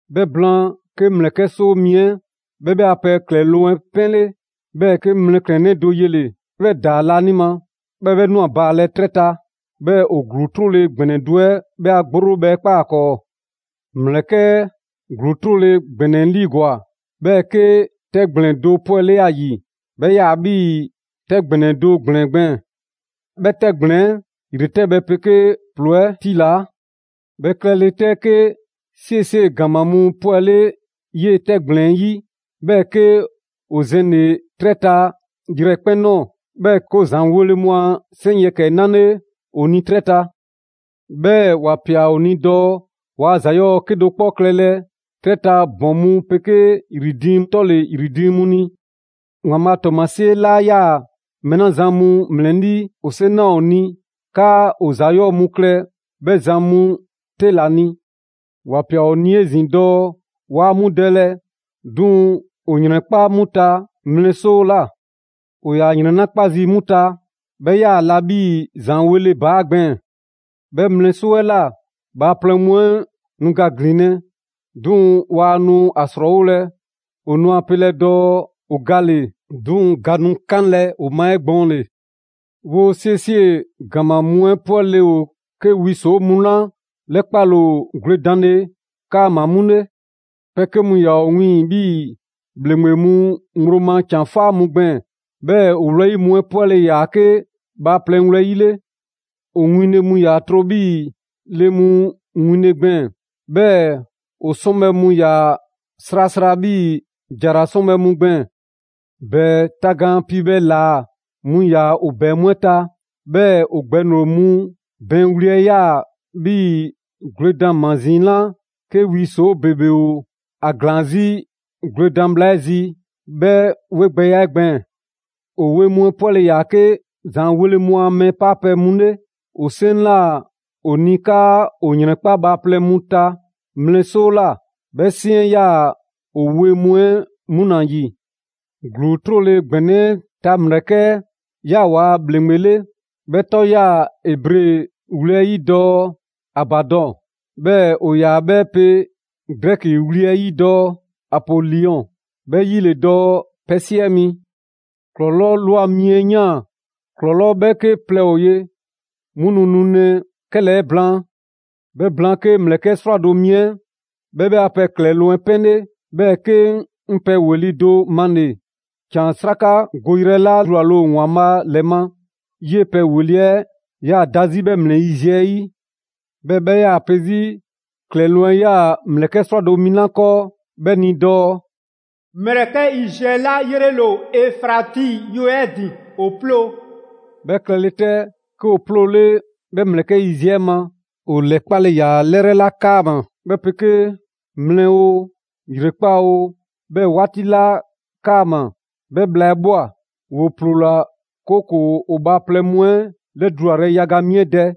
'Bhɛ blaan, 'ke ‑mlɛkɛ' 'soo mi 'ɛ 'bhɛ 'bhɛ a pɛ ‑klɛloŋ' 'ɛ 'pɛnle. 'Bhɛɛ‑ 'ke 'ŋ mlɛklɛnnɛ do yele‑, 'bhɛ ‑daa laanima, 'bhɛɛ‑ 'bhɛ ꞊nwa baalɛ 'trɛ ta. 'Bhɛɛ‑ ‑o ‑gluu 'trole‑ ‑gbɛnɛ do 'ɛ 'bhɛ a gborobhɛ 'ɛ ꞊kpaa ‑a 'kɔɔ. Mlɛklɛn‑ 'ɛ ‑gluu 'trole‑ ‑gbɛnɛ 'ɛ 'liigwa‑, 'bhɛɛ‑ 'ke 'tɛgblɛn‑ do 'pwɛle ‑a ‑yi; 'bhɛ 'yaa‑ 'bhii‑ 'tɛ ‑gbɛnɛ do ‑gblɛn gbɛɛn‑. 'Bhɛ 'tɛgblɛn‑ 'ɛ ‑yretɛbhɛ 'pegee ‑ploo 'ɛ 'tilaa. 'Bhɛ klɛle 'tɛ, 'ke 'siesie‑ ‑gama mu 'pwɛle 'yee‑ 'tɛgblɛn‑ 'ɛ 'yi, 'bhɛɛ‑ 'ke ‑o zɛnle‑ 'trɛ ta yrɛkpɛn‑ ꞊nɔɔ. 'Bhɛɛ‑ 'ke ‑o ‑zaanweele mu a 'seŋ ‑yɛkɛ 'ɛ 'nale ‑o ni 'trɛ ta. 'Bhɛɛ‑ ‑wa ꞊pia ‑o ni dɔɔ waa ‑za 'yɔɔ‑ 'kedo‑ 'kpɔ klɛlɛ 'trɛ ta ‑bɔn mu 'pegee ‑yri diiŋ 'tɔle‑ ‑yri diiŋ 'mu ni. ‑Waanbhaa' a ‑tɔɔmasie laa ‑yaa mɛɛ 'la zan mu ‑mlɛlii', ‑o 'seŋ ꞊naa ‑o ni 'kaa ‑o ‑za 'yɔɔ‑ mu klɛ 'bhɛ zan mu 'te ‑la ni. ‑Wa ꞊pia ‑o ni 'ezin‑ dɔɔ waa 'mu dɛlɛ, 'duŋ‑ ‑o ‑yrɛnkpa' 'mu ta mlɛ 'soo ꞊la. ‑O ‑yaa ‑yrɛn 'la 'kpa zii' 'mu ta, 'bhɛ ‑yaa la 'bhii‑ ‑zaanweele ‑baa' gbɛɛn‑. 'Bhɛ mlɛ 'soo 'ɛ ꞊la, bhaaplɛŋ mu 'ɛ nu ga ‑glinlɛ', 'duŋ‑ waa nu ‑a 'srɔɔwolɛ. ‑O nu ‑a pelɛ dɔɔ ‑o gale‑, 'duŋ‑ ga nu 'kanlɛ‑ ‑o ma 'egbɔɔnle. 'Woo‑ 'siesie‑ ‑gama mu 'ɛ 'pwɛle‑ ‑o 'ke wi ‑soo' mu 'la 'lɛkpale ‑o gwledanle 'kaama‑ 'mu 'le. Pɛ 'ke mu ‑yaa ‑o wiiŋ‑ 'bhii‑ ‑bhleŋgbe mu ŋgblo ma ‑can 'faa mu gbɛɛn‑, 'bhɛɛ‑ ‑o wlɛyi' mu 'ɛ 'pwɛle‑ ‑yaa 'ke bhaaplɛŋ wlɛyi' 'le. ‑O winle mu 'ɛ 'yaa‑ tro 'bhii‑ le mu winle gbɛɛn‑, 'bhɛɛ‑ ‑o 'sɔnbhɛ‑ mu 'ɛ 'yaa‑ srasra 'bhii‑ ‑jara 'sɔnbhɛ‑ mu gbɛɛn‑. ‑Bɛɛ tagaan piibhɛ ‑laa mu ‑yaa ‑o ‑bɛɛ mu 'ɛ ta. 'Bhɛɛ‑ ‑o gbɛŋroŋ‑ mu bɛɛn wli 'ɛ 'yaa‑ 'bhii‑ gwledan ‑mazini 'la 'ke wi ‑soo' ‑bebe ‑o ‑a ‑glaan 'zi gwledan bhla 'ɛ zi 'bhɛ 'wegbɛya 'ɛ gbɛɛn‑. ‑O wee mu 'ɛ 'pwɛle‑ ‑yaa 'ke ‑zaanweele mu a mɛɛ 'paapɛ‑ mu 'ɛ 'le. ‑O 'seŋ 'la ꞊naa ‑o ni 'kaa ‑o ‑yrɛnkpa' bhaaplɛŋ mu ta mlɛ 'soo ꞊la, 'bhɛ 'seŋ 'ɛ 'yaa‑ ‑o wee mu 'ɛ 'mu ‑la ‑yi. ‑Gluu 'trole‑ ‑gbɛnɛ 'ɛ ta ‑mlɛkɛ' 'ɛ ꞊yaa waa ‑bhleŋgbe 'le. 'Bhɛ 'tɔ 'yaa‑ Ebre wli 'ɛ 'yi dɔɔ: «Abadɔn». 'Bhɛɛ‑ ‑o ‑yaa 'bhɛ pe Grɛki wli 'ɛ 'yi dɔɔ: «Apoliyɔn». 'Bhɛ 'yi ‑le dɔɔ: Pɛ 'siɛ mi. ‑Klɔlɔɔ' ꞊lwa mi 'ɛ ꞊yaan. ‑Klɔlɔɔ' 'bhɛɛke plɛ ‑o ye, 'mu nu nulɛ 'kɛlɛɛ‑ blaan. 'Bhɛ blaan, 'ke ‑mlɛkɛ' 'srwado‑ mi 'ɛ 'bhɛ 'bhɛ a pɛ ‑klɛloŋ' 'ɛ 'pɛnle. 'Bhɛɛ‑ 'ke 'ŋ pɛ ‑weli' do 'male. ‑Can 'srakagoyrɛ 'la dulale ‑o ‑Waanbhaa' ‑lɛ ma, 'yee‑ pɛ ‑weli' 'ɛ 'yaa‑ da 'zi 'bhɛ 'mlɛ yiziɛ 'ɛ 'yi. 'Bhɛɛ‑ 'bhɛ ‑yaa pe 'zi ‑klɛloŋ' 'yaa‑ ‑mlɛkɛ' 'srwado‑ mi 'la 'kɔɔ 'bhɛ ni dɔɔ: «‑Mlɛkɛ' yiziɛ 'la 'yrele‑ ‑o Efrati yue 'ɛ ‑din ‑o 'ploo‑.» 'Bhɛ klɛle 'tɛ, 'ke ‑o 'ploole 'bhɛ ‑mlɛkɛ' yiziɛ 'ɛ ma; ‑o 'lɛkpale ‑yaa 'lɛrɛ 'la 'kaama‑, 'bhɛ 'pegee mlɛ oo, ‑yrekpaa' oo, 'bhɛɛ‑ 'waati 'la 'kaama‑, 'bhɛ bhla 'ɛ ꞊bhwa. ‑Woo 'ploola‑, 'kooko‑ ‑o bhaaplɛŋ mu 'ɛ 'lɛdulayrɛ yaga mi 'ɛ dɛ.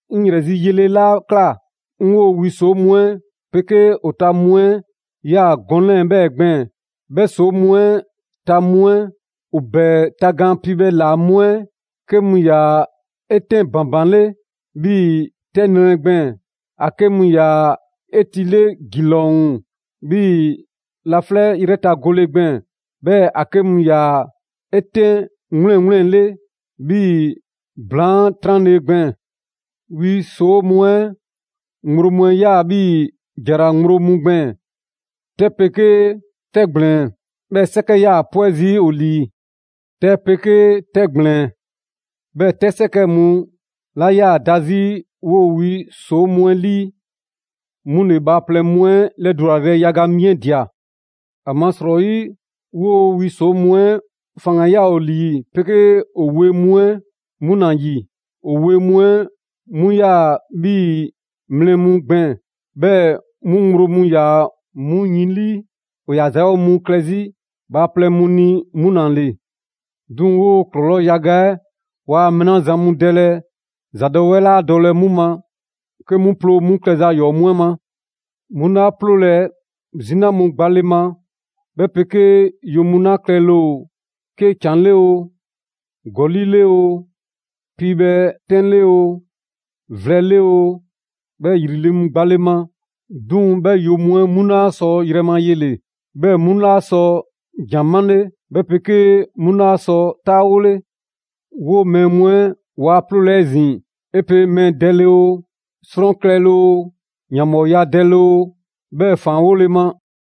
'Ŋ ‑yrɛ zi yele 'la ꞊kla, 'ŋ 'woo‑ wi ‑soo' mu 'ɛ 'pegee ‑o ta mu 'ɛ ꞊ya gɔnɛ‑ 'lɛɛ‑ 'bhɛɛ‑ gbɛɛn‑: 'Bhɛ ‑soo' mu 'ɛ ta mu 'ɛ, ‑o ‑bɛɛ tagaan piibhɛ ‑laa mu 'ɛ 'ke mu ‑yaa 'etɛn ‑banbanle 'bhii‑ 'tɛ nrɛ gbɛɛn‑, ‑a 'ke mu ‑yaa 'etile ‑gilɔŋ 'bhii‑ laflɛ' 'yrɛ ta gole gbɛɛn‑, 'bhɛɛ‑ ‑a 'ke mu ‑yaa 'etɛn 'wleŋwleŋle 'bhii‑ ‑blaan 'tranle‑ gbɛɛn‑. Wi ‑soo' mu 'ɛ ŋgblo mu 'ɛ 'yaa‑ 'bhii‑ ‑jara ŋgblo mu gbɛɛn‑. 'Tɛ 'pegee 'tɛgblɛn‑ 'bhɛɛ‑ 'sɛkɛ 'yaa‑ 'pwɛ zii' ‑o ‑lii. 'Tɛ 'pegee 'tɛgblɛn‑, 'bhɛɛ‑ 'tɛ 'sɛkɛ mu 'la 'yaa‑ da 'zi 'woo‑ wi ‑soo' mu 'ɛ 'lii 'mu ‑le bhaaplɛŋ mu 'ɛ 'lɛdulayrɛ yaga mi 'ɛ ꞊dia. ‑Amasrɔyi 'woo‑ wi ‑soo' mu 'ɛ faŋgan‑ 'ɛ 'yaa‑ ‑o ‑lii 'pegee ‑o wee mu 'ɛ 'mu ‑la ‑yi. ‑O wee mu 'ɛ 'mu 'yaa‑ 'bhii‑ mlɛ mu gbɛɛn‑, 'bhɛɛ‑ 'mu ŋgblo mu ‑yaa 'mu yin 'lii. ‑O ‑yaa ‑za 'yɔɔ‑ mu klɛ 'zi bhaaplɛŋ mu ni 'mu ‑la ‑le. 'Duŋ‑ 'woo‑ ‑klɔlɔɔ' yaga 'ɛ waa mɛɛ 'la zan mu dɛlɛ, ‑zadɔwɛɛ 'laa dɔlɛ 'mu ma, 'ke 'mu ploo 'mu klɛza 'yɔɔ‑ mu 'ɛ ma. 'Mu 'laa 'ploolɛ‑ 'zina mu gbale ma, 'bhɛ 'pegee yo mu 'la klɛle‑ ‑o 'ke ‑can 'le oo, ‑gɔli' 'le oo, piibhɛ 'tɛn 'le oo, vlɛ 'le oo, 'bhɛɛ‑ ‑yri 'le 'mu gbale ma. 'Duŋ‑ 'bhɛ yo mu 'ɛ 'mu 'laa sɔ yrɛ ma yele‑, 'bhɛɛ‑ 'mu 'laa sɔ ‑jan 'male, 'bhɛ 'pegee 'mu 'laa sɔ 'taawole. 'Woo‑ mɛɛ mu 'ɛ waa 'ploolɛ‑ 'ezin‑ 'e pe mɛɛ dɛle oo, 'srɔn klɛle oo, ‑yanbhɔɔya dɛle oo, 'bhɛɛ‑ ‑faanwole ma.